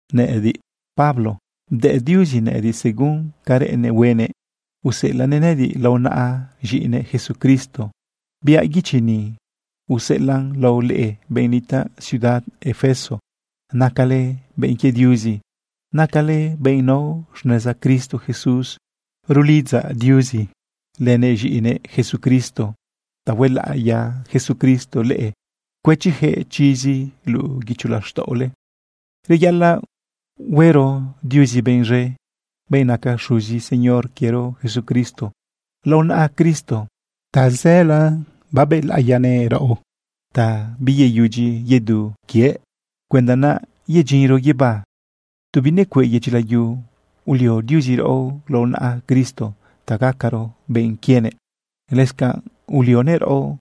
Nëꞌëdiꞌ, Pablo, bdëꞌ Diuzi nëꞌëdiꞌ según ca reꞌennëꞌ huenëꞌ useꞌelaꞌnëꞌ nëꞌëdiꞌ lao naꞌa z̃iꞌinëꞌ Jesucristo. Biaꞌ guichi ni useꞌelaꞌn lao leꞌe benꞌ nitaꞌ ciudad Efeso. Nacale benꞌ quie Diuzi. Nacale benꞌ nao xneza Cristo Jesús. Rulidzaꞌ Diuzi lënëꞌ z̃iꞌinëꞌ Jesucristo ta huelaꞌiya Jesucristo leꞌe cuëchiyaquëꞌ chizi luꞌu guicho laxtaꞌole. Reyaꞌalaꞌ huero Diuzi benꞌ z̃e, benꞌ naca xuzi Señor quiero Jesucristo. Lao naꞌa Cristo tazëla babëlaꞌiyanëꞌ raꞌo ta biyeyudyi yedu quië cuenda naꞌ yedyinro guibá. Tu binecueꞌ yedyi layu ulio Diuzi raꞌo lao naꞌa Cristo ta gacaro benꞌ quienëꞌ. Lëscanꞌ ulionëꞌ raꞌo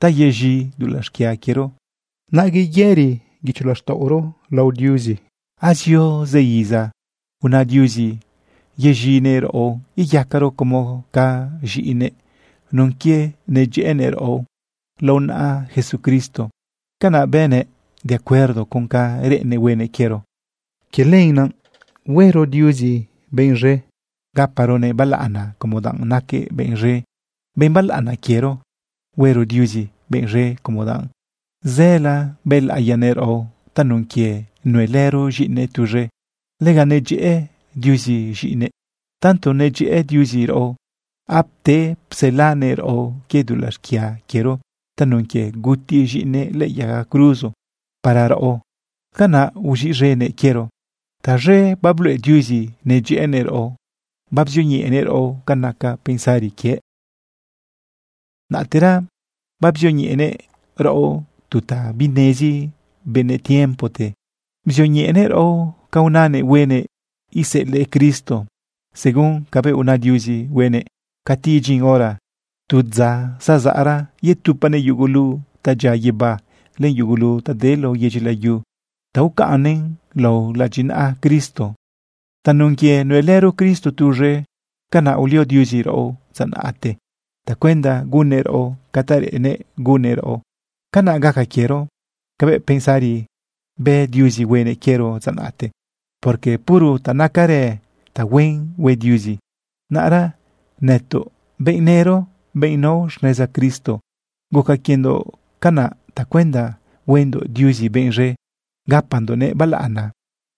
ta yez̃i dulaꞌ xquia quiero, naꞌ yeyëri guicho laxtaꞌoro lao Diuzi. Azio zë iza una Diuzi yeziꞌnëꞌ raꞌo iyacaro como ca z̃iꞌinëꞌ nun quie nedyëꞌënëꞌ raꞌo lao naꞌa Jesucristo. Canaꞌ bënëꞌ de acuerdo con ca reꞌennëꞌ huenëꞌ quiero. Quie lenaꞌ huero Diuzi benꞌ z̃e gaparonëꞌ balaꞌana como danꞌ naquëꞌ benꞌ z̃e, benꞌ balaꞌana quiero. Huero Diuzi benꞌ z̃e como danꞌ zëla bëlaꞌiyanëꞌ raꞌo tanun quie nuelëro z̃iꞌinëꞌ tuz̃e. Lega nedyëꞌë Diuzi z̃iꞌinëꞌ. Tanto nedyëꞌë Diuzi raꞌo, apte pselanëꞌ raꞌo quie dulaꞌ xquia quiero tanun quie guti z̃iꞌinëꞌ lëꞌë yaga cruzo para raꞌo, canaꞌ uz̃iꞌz̃enëꞌ quiero. Taz̃e babluꞌe Diuzi nedyëꞌënëꞌ raꞌo babzioñeꞌenëꞌ raꞌo ca naca pensari quiëꞌ. Naꞌtera babzioñeꞌenëꞌ raꞌo tu ta binezi benëꞌ tiempote. Bzioñeꞌenëꞌ raꞌo ca unanëꞌ huenëꞌ iseꞌelëꞌ Cristo. Según cabëꞌ una Diuzi huenëꞌ cati idyin hora tu dza zazaꞌra, yetupanëꞌ yugulu ta dyia guibá, len yugulu ta de lao yedyi layu, ta ucaꞌnnëꞌn lao ladyinaꞌa Cristo. Tanun quie nuelëro Cristo tuz̃e, canaꞌ ulio Diuzi raꞌo dza naꞌte tacuenda gunnëꞌ raꞌo ca ta reꞌennëꞌ gunnëꞌ raꞌo. Canaꞌ gaca quiero cabëꞌ pensari bë Diuzi huenëꞌ quiero dza naꞌte, porque puro ta nacarë tahuen hue Diuzi. Naꞌra nëtoꞌ, benꞌ nëro, benꞌ nao xneza Cristo, guca quiendoꞌ canaꞌ tacuenda huendoꞌ Diuzi benꞌ z̃e gapandoꞌnëꞌ balaꞌana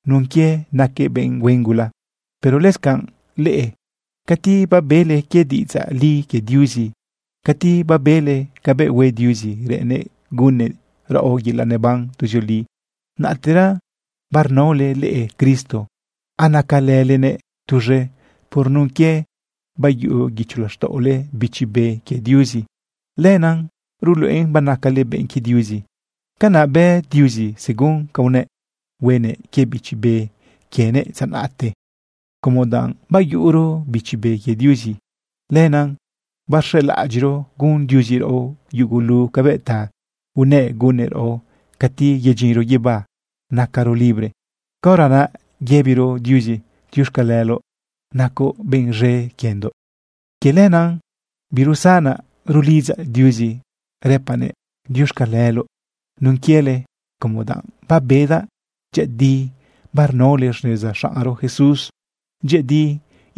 nun quie naquëꞌ benꞌ huen gula. Pero lëscanꞌ leꞌe, cati babele quie diꞌidzaꞌ li quie Diuzi, cati babele cabëꞌ hue Diuzi reꞌennëꞌ gunnëꞌ raꞌo yelaꞌ neban tuzioli, naꞌtera barnaole leꞌe Cristo, anacalëlenëꞌ tuz̃e. Por nun quie bayuꞌu guicho laxtaꞌole Bichi Be que Diuzi, lenaꞌ ruluꞌen banacale benꞌ quie Diuzi. Canaꞌ bë Diuzi según ca unëꞌ huenëꞌ quie Bichi Be quienëꞌ dza naꞌte. Como danꞌ bayuꞌuro Bichi Be quie Diuzi, lenaꞌ barz̃elaꞌadyiꞌro gun Diuzi raꞌo yugulu cabëꞌ ta unëꞌ gunnëꞌ raꞌo cati yedyinro guibá nacaro libre. Caora naꞌ yëbiro Diuzi: “Diuxcaleloꞌ nacoꞌ benꞌ z̃e quiendoꞌ.” Quie lenaꞌ birusanaꞌ rulidzaꞌ Diuzi rëpaꞌnëꞌ diuxcaleloꞌ nun quiele como danꞌ babedaꞌ dyëꞌëdi barnaole xneza xaꞌnro Jesús, dyëꞌëdi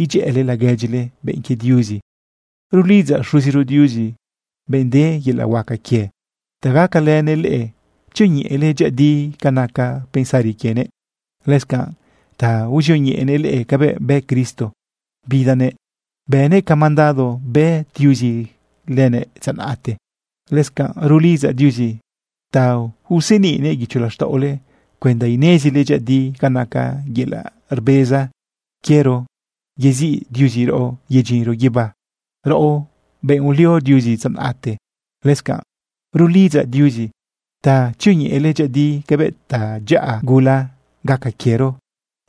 idyëꞌële laguedyile, benꞌ quie Diuzi. Rulidzaꞌ Xuziro Diuzi, benꞌ de yelaꞌ huaca quie, ta gacalënëꞌ leꞌe tzioñeꞌele dyëꞌëdi ca naca pensari quienëꞌ, lëscanꞌ ta uzioñeꞌenëꞌ leꞌe cabëꞌ bë Cristo, bidanëꞌ bënëꞌ ca mandado bë Diuzi lëbëꞌ dza naꞌte. Lëscanꞌ rulidzaꞌ Diuzi ta useniꞌnëꞌ guicho laxtaꞌole cuenda inezile dyëꞌëdi ca naca yelaꞌ rbeza quiero yeziꞌ Diuzi raꞌo yedyinro guibá, raꞌo benꞌ ulio Diuzi dza naꞌte. Lëscanꞌ rulidzaꞌ Diuzi ta tzioñeꞌele dyëꞌëdi cabëꞌ tadyaꞌa gula gaca quiero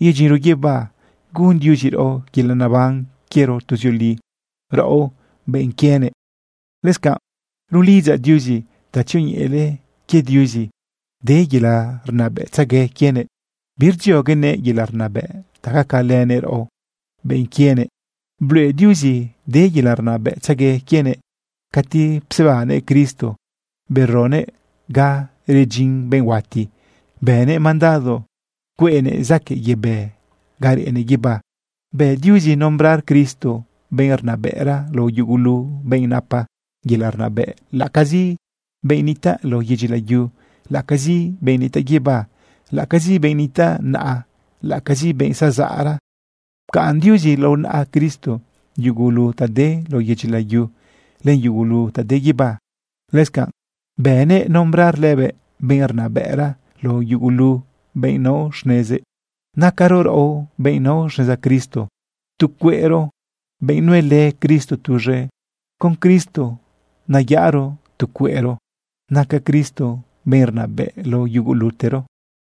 yedyinro guibá gun Diuzi raꞌo yelaꞌ neban quiero tuzioli, raꞌo benꞌ quienëꞌ. Lëscanꞌ rulidzaꞌ Diuzi ta tzioñeꞌele quie Diuzi de yelaꞌ rnabëꞌtzegue quienëꞌ, birdzioguenëꞌ yelaꞌ rnabëꞌ ta gacalënëꞌ raꞌo, benꞌ quienëꞌ. Bluꞌe Diuzi de yelaꞌ rnabëꞌtzegue quienëꞌ cati psebannëꞌ Cristo beroguëꞌ ga redyin benꞌ huati, bënëꞌ mandado cueꞌnëꞌ zaquëꞌ yebë ga reꞌnëꞌ guibá. Bë Diuzi nombrar Cristo benꞌ rnabëꞌra lao yugulu benꞌ napa yelaꞌ rnabëꞌ, laꞌacazi benꞌ nitaꞌ lao yedyi layu, laꞌacazi benꞌ nitaꞌ guibá, laꞌacazi benꞌ nitaꞌ naꞌa, laꞌacazi benꞌ zazaꞌra. Pcaꞌn Diuzi lao naꞌa Cristo yugulu ta de lao yedyi layu len yugulu ta de guibá. Lëscanꞌ bënëꞌ nombrar lëbëꞌ benꞌ rnabëꞌra lao yugulu benꞌ nao xnezëꞌ. Nacaro raꞌo, benꞌ nao xneza Cristo, tu cueꞌro benꞌ nuelë Cristo tuz̃e. Con Cristo nayaꞌaro tu cueꞌro. Naca Cristo benꞌ rnabëꞌ lao yugulutero.